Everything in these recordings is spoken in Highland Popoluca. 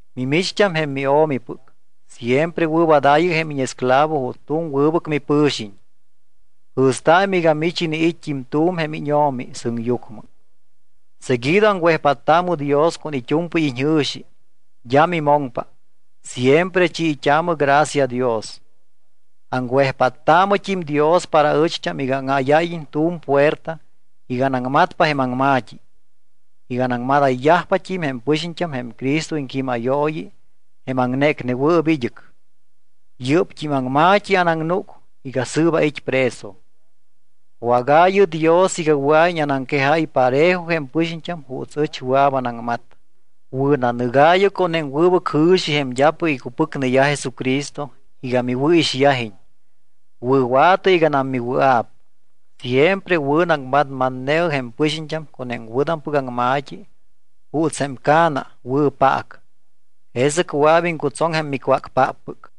Mimicht́am jém mio̱mipɨc siempre wɨ̱wadaayɨ jém íñesclavo juuts tu̱m wɨbɨc mipɨ̱xiñ. Jɨ̱staamɨ iga mich iniit́t́im tu̱m jém íñO̱mi sɨŋyucmɨ. Seguido aŋwejpáttaamɨ Dios con it́u̱mpɨy iñjɨ̱xi, d́a mimoŋpa, siempre chiit́aamɨ gracia Dios. Aŋwejpáttaamɨt́im Dios para aɨcht́am iga áŋáyáyiñ tu̱m puerta iga anaŋmatpa jém aŋma̱t́i, iga anaŋmadáypat́im jém pɨxiñt́am jém Cristo iŋquímayooyi jém aŋnécnewɨɨp id́ɨc. Yɨ́pt́im aŋma̱t́i anaŋnúc iga sɨɨp ait́ preso. Wágaayɨ Dios iga wɨa̱iñ anaŋquejáy parejo jém pɨxiñt́am juuts ɨch wɨa̱p anaŋmat. Wɨ̱nanɨgaayɨ con jém wɨbɨc jɨ̱xi jém d́apɨc icupɨcneyaj Jesucristo iga miwɨ̱ixyajiñ, wɨ̱wa̱tɨ iganam miwɨa̱p. Siempre wɨ̱naŋmatmatne̱ɨ jém pɨxiñt́am con jém wɨ̱tampɨc aŋma̱t́i juuts jém ca̱na wɨ̱ paac. Jesɨc wɨa̱p iŋcutsoŋ jém micwácpáppɨc.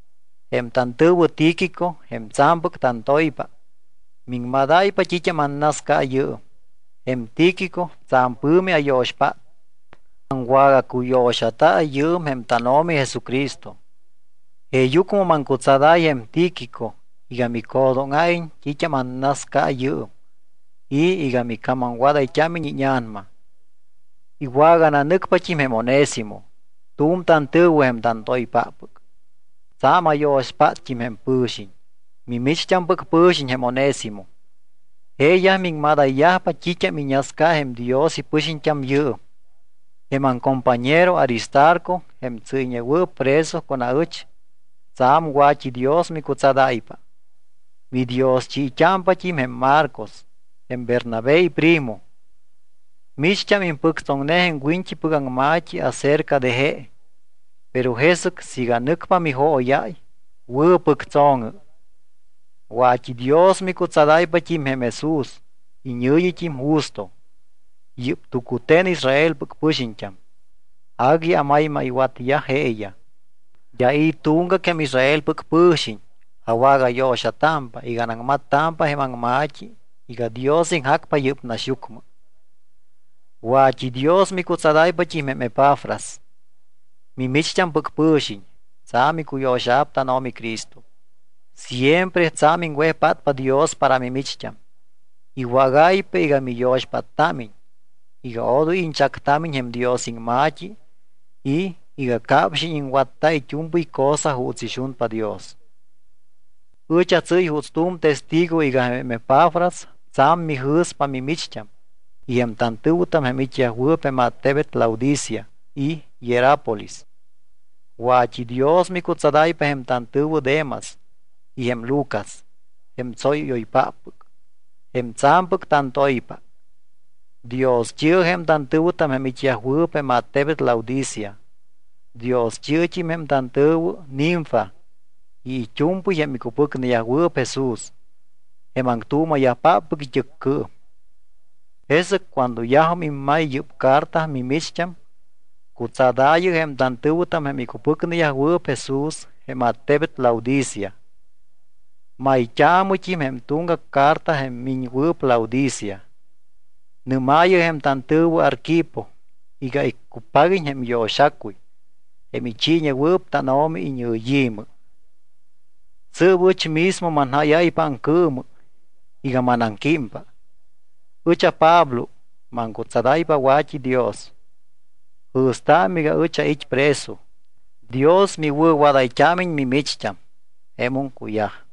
Jém tantɨ̱wɨ Tíquico, jém tsa̱mpɨc tantoypa, miŋmadáypa t́it́am annasca yɨɨm. Jém Tíquico tsa̱m pɨ̱mi ayo̱xpát. Aŋwagacuyo̱xata yɨɨm jém tánO̱mi Jesucristo. Jeeyucmɨ maŋcutsadáy jém Tíquico iga micjo̱dóŋa̱iñ t́it́am annascata yɨɨm y iga micamamwadayt́ámiñ íña̱nama. Iwagananɨcpat́im jém Onésimo, tu̱m tantɨ̱wɨ jém tantoypáppɨc. Tsa̱m ayo̱xpátt́im jém pɨ̱xiñ. Mimicht́ampɨc pɨ̱xiñ jém Onésimo. Jeeyaj miŋmadayyajpa t́it́am iñasca jém Dios ipɨxiñt́am yɨɨm. Jém aŋcompañero Aristarco, jém tsɨ́yñewɨɨp preso con aɨch, tsa̱m wa̱t́idios micutsadáypa. Midioschit́ámpat́im jém Marcos jém Bernabé iprimo. Micht́am impɨctsoŋne jém wiñt́ipɨc aŋma̱t́i acerca de je, pero jesɨc siiga nɨcpa mijóyáy, wɨ̱pɨctso̱ŋɨ. Wa̱t́idios micutsadáypat́im jém Jesús, iñɨ̱yit́im Justo. Yɨ́p tucute̱n Israelpɨc pɨxiñt́am, agui amaymaywatyaj jeeyaj. D́a i̱ tuŋgac jém Israelpɨc pɨ̱xiñ awagayo̱xatámpa iga anaŋmattámpa jém aŋma̱t́i iga Dios iŋjacpa yɨ́p naxyucmɨ. Wa̱t́idios micutsadayt́ámpat́im jém Epafras. Mimicht́ampɨc pɨ̱xiñ. Tsa̱m icuyo̱xa̱p tánO̱mi Cristo. Siempre tsa̱m iŋwejpátpa Dios para mimicht́am, iwágáypa iga miyo̱xpáttámiñ iga odoy iñchactámiñ jém Dios iŋma̱t́i y iga capxiñ iŋwatta it́u̱mpɨy cosa juuts ixunpa Dios. Ɨch atsɨ́y juuts tu̱m testigo iga jém Epafras tsa̱m mijɨ̱spa mimicht́am y jém tantɨ̱wɨtam jém it́yajwɨɨp jém attebet Laodicea y Hierápolis. Wa̱t́idios micutsadáypa jém tantɨ̱wɨ Demas y jém Lucas, jém tsóyɨ́yoypáppɨc, jém tsa̱mpɨc tantoypa. Dioschi̱ɨ jém tantɨ̱wɨtam jém it́yajwɨɨp jém attebet Laodicea. Dioschi̱ɨt́im jém tantɨ̱wɨ Ninfa y it́u̱mpɨy jém icupɨcneyajwɨɨp Jesús, jém aŋtuuma̱yajpáppɨc it́ɨccɨɨm. Jesɨc cuando yajum immay yɨ́p carta mimicht́am, cutsadaayɨ jém tantɨ̱wɨtam jém icupɨcneyajwɨɨp Jesús jém attebet Laodicea. Mayt́aamɨt́im jém tuŋgac carta jém miñwɨɨp Laodicea. Nɨ́maayɨ jém tantɨ̱wɨ Arquipo iga iccupaguiñ jém iyo̱xacuy, jém ichiiñewɨɨp tánO̱mi iñɨyi̱mɨ. Sɨɨp ɨch mismo manjáyáypa aŋcɨɨmɨ iga manaŋquímpa. Ɨch aPablo maŋcutsadáypa wa̱t́idios. Jɨ̱staamɨ iga ɨch ait́ preso. Dios miwɨ̱wadayt́ámiñ mimicht́am. Jemum cuyaj.